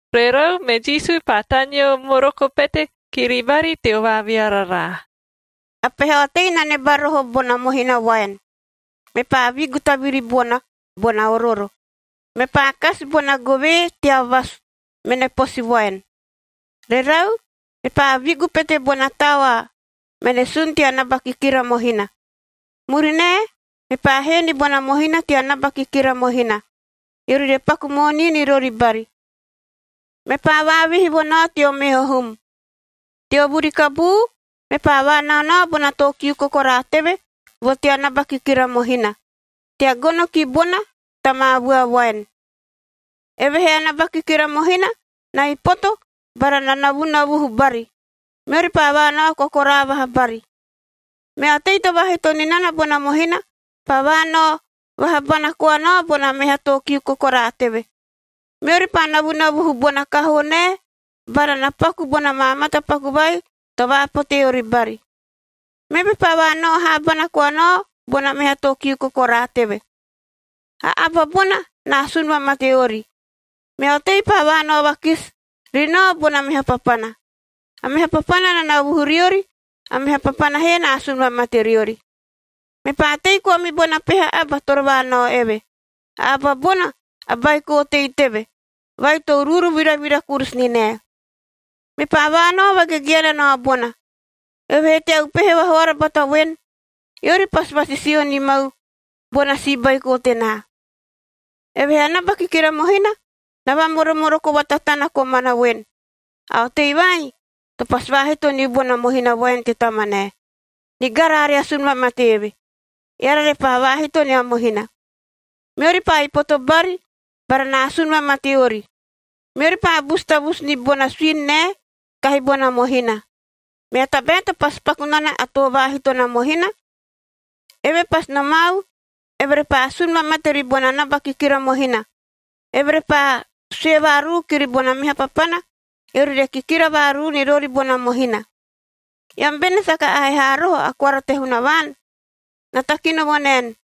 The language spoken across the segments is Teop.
Rerau, me Jisu paa taneo moroko pete kiri bari teo vaaviararaa, “A peha otei na neba roho bona mohina voaen. Mepaa vigu taviri bona, bona orooro, mepaa kasi bona govee tea vasu mene posi voaen. Rerau, mepaa vigu pete bona taoa mene sun tea naba kikira mohina. Murinae, mepaa hee ni bona mohina tea naba kikira mohina, eori re paku moonii ni rori bari. Mepaa vaavihi vo nao teo meho hum. “Teo vuri kabuu, mepaa vaanaonao bona too kiu kokoraa teve vo tea naba kikira mohina tea gono ki bona ta maa vua voaen. Evehee a naba kikira mohina na ipoto bara na navunavuhu bari, meori paa vaanao kokoraa vaha bari. Mea otei to vaahito ni nana bona mohina paa vaanao vaha bana koa nao bona meha too kiu kokoraa teve. Meori paa navunavuhu bona kahoo nae bara na paku bona maa matapaku vai to vaapote ori bari. Meve paa vaanao haabana koa nao bona meha too kiu kokoraa teve. A aba bona na asun vamate ori. Mea otei paa vaanao vakisi ri nao bona meha papana. A meha papana na navuhu riori, a meha papana he na asun vamate riori. “Mepaa tei koa me bona peha aba toro vaanao eve. A aba bona a baiko otei teve vai to uruuru viravira kurusu ni nae. Mepaa vaanao vagegeana nao bona, eove he tea upehe vahoara bata voen, ‘Eori pasi vasisio ni mau bona si baiko tenaa.’ “Evehee a naba kikira mohina na vamoromoroko vatatana komana voen, ‘A otei vai to pasi vaahito niu bona mohina voaen te tamanae. Nigara, are asun vamate eve, eara repaa vaahito nia mohina!’ Meori paa ipoto bari bara na asun vamate ori. Meori paa busu tavusu ni bona suini nae kahi bona mohina. “Mea tabae to pasi paku nana a too vaahito na mohina? Eve pasi nomau, eve repaa asun vamate ribona naba kikira mohina. Eve repaa sue vaaruu kiri bona meha papana, eori re kikira vaaruu ni rori bona mohina. Eam bene saka ahe haa roho a koara te Hunavaan? Na takino vo naen,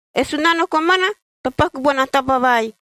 E Sunano komana to paku bona taba vai,b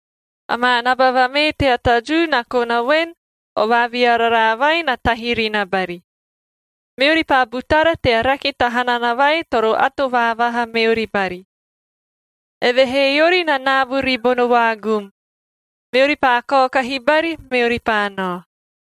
Amaa naba vamee tea ta Jiu na kona voen, o vaaviararaa vai na tahi ri na bari. Meori paa butara tea rake ta hanana vai toro ato vaavaha meori bari. Evehee eori na naabu ribono vaagum, meori paa kaokahi bari, meori paa nao.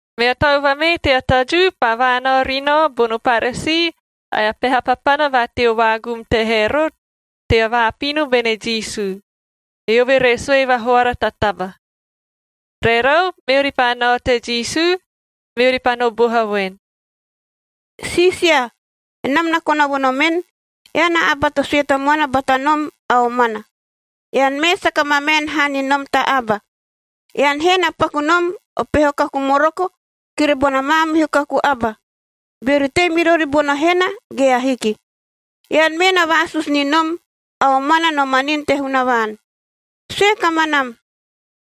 Mea tau vamee tea ta Jiu paa vaanao ri nao bono Paresii ae a peha papana va teo vaagum te Herotd tea vaapino bene Jisu, eove re sue vahoara ta taba. Rerau, meori paa nao te Jisu, meori paa no boha voen, “Siisia, enam na kona vo nomen, ean a aba to sue tamuana bata nom a omana. Ean mee saka mamaen haa ni nom ta aba. Ean he na paku nom o peho kaku moroko kiri bona maamihu kaku aba, beori tei me rori bono hena ge ahiki. Ean mee na vaasusu ni nom a omana no manin te Hunavaan. Sue kamanam,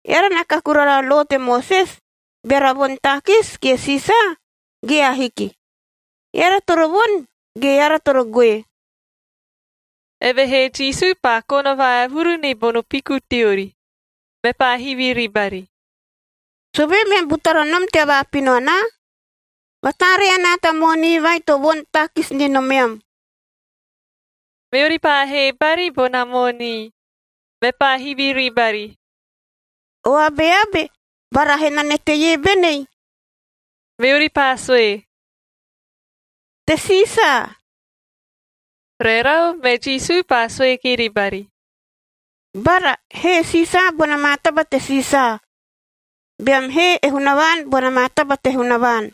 eara na kaku rara a lo te Moses beara voni taakis kie Siisaae, ge ahiki? Eara toro voni ge eara toro goe?” Evehee Jisu paa kona vaevuru ni bono piku teori, mepaa hivi ribari, “Sovee meam butara nom tea vaapino anaa? Vataaree anaa ta moonii vai to voni taakis ni nomeam.f” Meori paa hee bari bona moonii. Mepaa hivi ribari, “O abeabe bara henane teie benei?” Meori paa sue, “Te Siisaa.” Rerau, me Jisu paa sue kiri bari, “Bara, hee e Siisaa bona maa taba te Siisaa, beam hee e Hunavaan bona maa taba te Hunavaan.”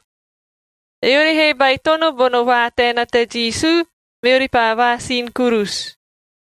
Eori he baitono bono vaataena te Jisu, meori paa vaasini kurusu.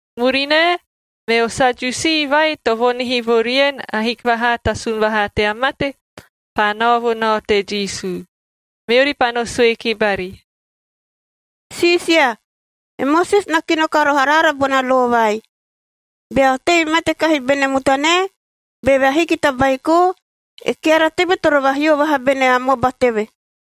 Murinae, meo Sadiusiig vai to voonihi vo rien ahiki vahaa ta sun vahaa tea mate, paa nao vo nao te Jisu. Meori paa no sue ki bari, “Siisia! E Moses na kino ka roho araara bona lo vai: Bea otei mate kahi bene mutanae, beve ahiki ta baiko, e keara teve toro vahio vaha bene amoba teve.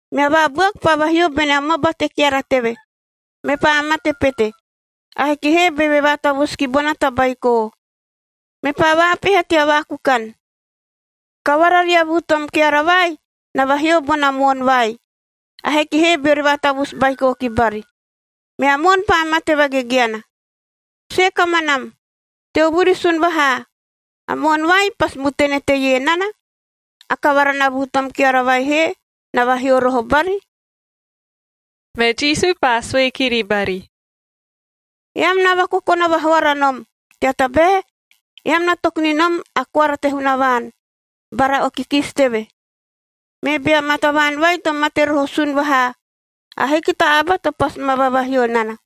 Mea vabuaku paa vahio bene amoba te keara teve, mepaa mate pete. Ahiki he beve vaatavusu ki bona ta baiko. Mepaa vaapeha tea vaakukan. Kavara ria vuu tom keara vai na vahio bona moon vai, ahiki he beori vaatavusu baiko ki bari. Mea moon paa mate vagegeana. Sue kamanam, teo vuri sun vahaa, a moon vai pasi mutene teie nana, a kavara na vuu tom keara vai he na vahio roho bari?” Me Jisu paa sue kiri bari, “Eam na vakokona vahoara nom, tea tabae eam na toku ni nom a koara te Hunavaan, bara o kikisi teve. Me bea maa tavaan vai to mate roho sun vahaa, ahiki ta aba to pasi ma vavahio nana.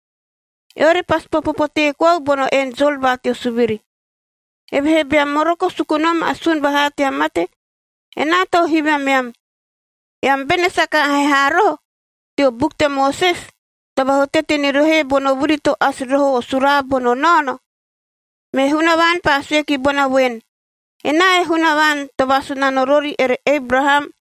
Eori pasi popo potee koau bono enjol va teo suviri. Evehee beam moroko suku nom a sun vahaa tea mate, enaa tau hivi ameam, eam bene saka ahe haa roho teo buku te Moses to vahutate ni rohoe bono vuri to asi roho o suraa bono naono? Me Hunavaan paa sue ki bona voen, ‘Enaa e Hunavaan to vaasunano rori ere Ebraham,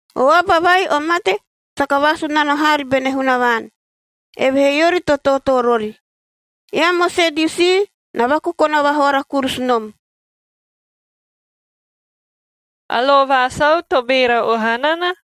O aba vai o mate saka vaasunano haari bene Hunavaan, evehee eori to tootoo rori.j Eam o Sadiusii na vakokona vahoara kurusu nom!” A lo va sau to beera oha nana?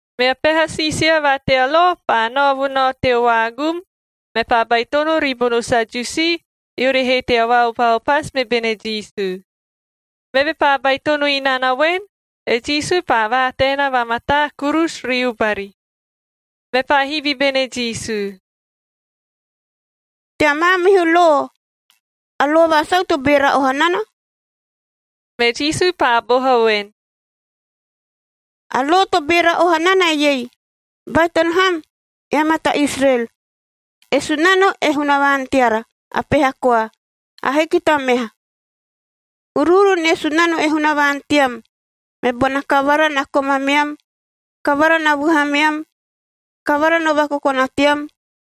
Mea peha siisia va tea lo paa nao vo nao teo vaagum, mepaa baitono ribono Sadiusii, eori he tea vaopaopasu me bene Jisu. Meve paa baitono inana voen, e Jisu paa vaataena vamataa kurusu riu bari. Mepaa hivi bene Jisu, “Tea maamihu lo, a lo va sau to beera oha nana?” Me Jisu paa boha voen, “A lo to beera oha nana eiei: ‘Baitono ham, eam a ta Israel! E Sunano e Hunavaan teara, a peha koa, ahiki ta meha. Uruuru nie Sunano e Hunavaan team me bona kavara na komameam, kavara na vuhameam, kavara no vakokona team,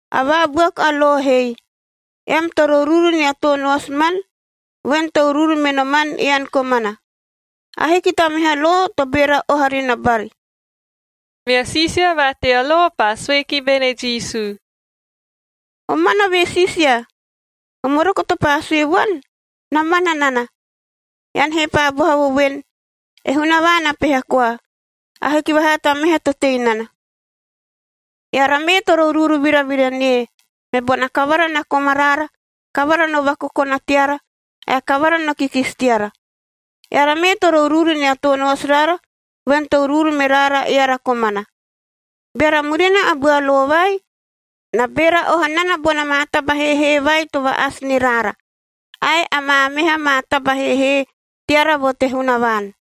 A vaabuaku a lo hei, ‘Ean toro uruuru nia too noasimanl voen to uruuru me noman ean komana.’m Ahiki ta meha lo to beera oha ri na bari.” Mea siisia va tea lo paa sue ki bene Jisu, “Omana ve, Siisia! O moroko to paa sue vuan na mana nana, ean he paa boha vo voen, e Hunavaan a peha koa. Ahiki vahaa ta meha to tei nana. Eara mee toro uruuru viravira nie, me bona kavara na komaraara, kavara no vakokona teara ae kavara no kikisi teara. Eara mee toro uruuru nia too noasiraara voen to uruuru me raara eara komana. Beara murina a bua lo vai, na beera oha nana bona maa taba heehee vai to va-asi ni raara ae amaa meha maa taba heehee teara vo te Hunavaan.”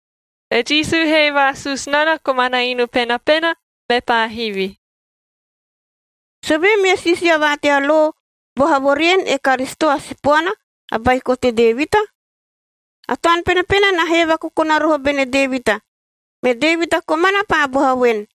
E Jisu he vaasusu nana komana inu penapena, mepaa hivi, “Sovee meo siisia va tea lo boha vo rien e Karisito a Sipoana a baiko te Devitan? A Taun Penapena na hee vakokona roho bene Devita, me Devita komana paa boha voen,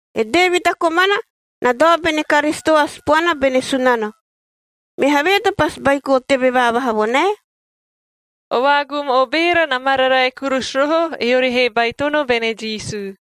“E Devita komana na dao bene Karisito a Sipoana bene Sunano, me havee to pasi baiko teve vaavaha vo nae?”r O vaagum o beera na mararae kurusu roho, eori he baitono bene Jisu.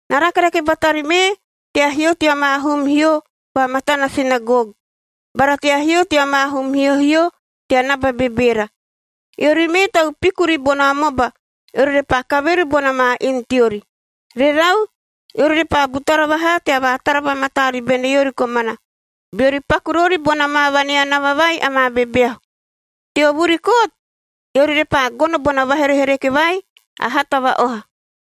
Na rakerake batari mee tea hio tea maa hum hio va matana sinagog bara tea hio tea maa hum hiohio tea naba bebeera. Eori mee tau piku ribono amoba, eori repaa kaveru bona maa inu teori. Rerau, eori repaa butara vahaa tea vaatara vamataa ribene eori komana, beori paku rori bona maa vaneanava vai amaa bebeahu. Teo vuri kot, eori repaa gono bona vaherehereke vai a hata va-oha.”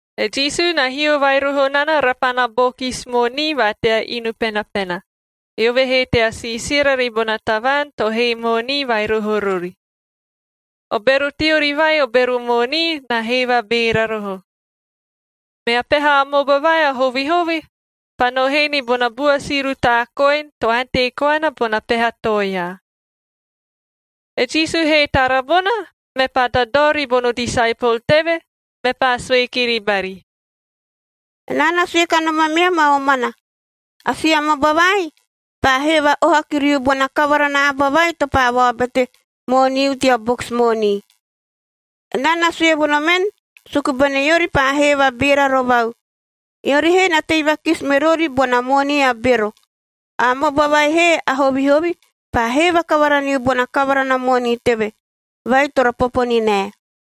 E Jisu na hio vai roho nana rapana bokis moonii va tea inu penapena, eove he tea siisira ribona tavaan to hee moonii vai roho rori. O bero teori vai o bero moonii na hee vabeera roho. Mea peha amoba vai a hovihovi paa no hee ni bona bua si rutaa koin to ante koana bona peha toea. E Jisu he tara bona, mepaa dadao ribono disaepol teve, mepaa sue kiri bari, “Enaa na sue kanom ameam a omana, a si amoba vai paa hee va-oha kiriu bona kavara na aba vai to paa vaobete mooniu tea bokis moonii. Enaa na sue vo nomen suku bene eori paa hee vabeera rovau, eori he na tei vakisi me rori bona moonii a bero. A amoba vai he a hovihovi paa hee vakavara niu bona kavara na moonii teve, vai toro popo ni nae.”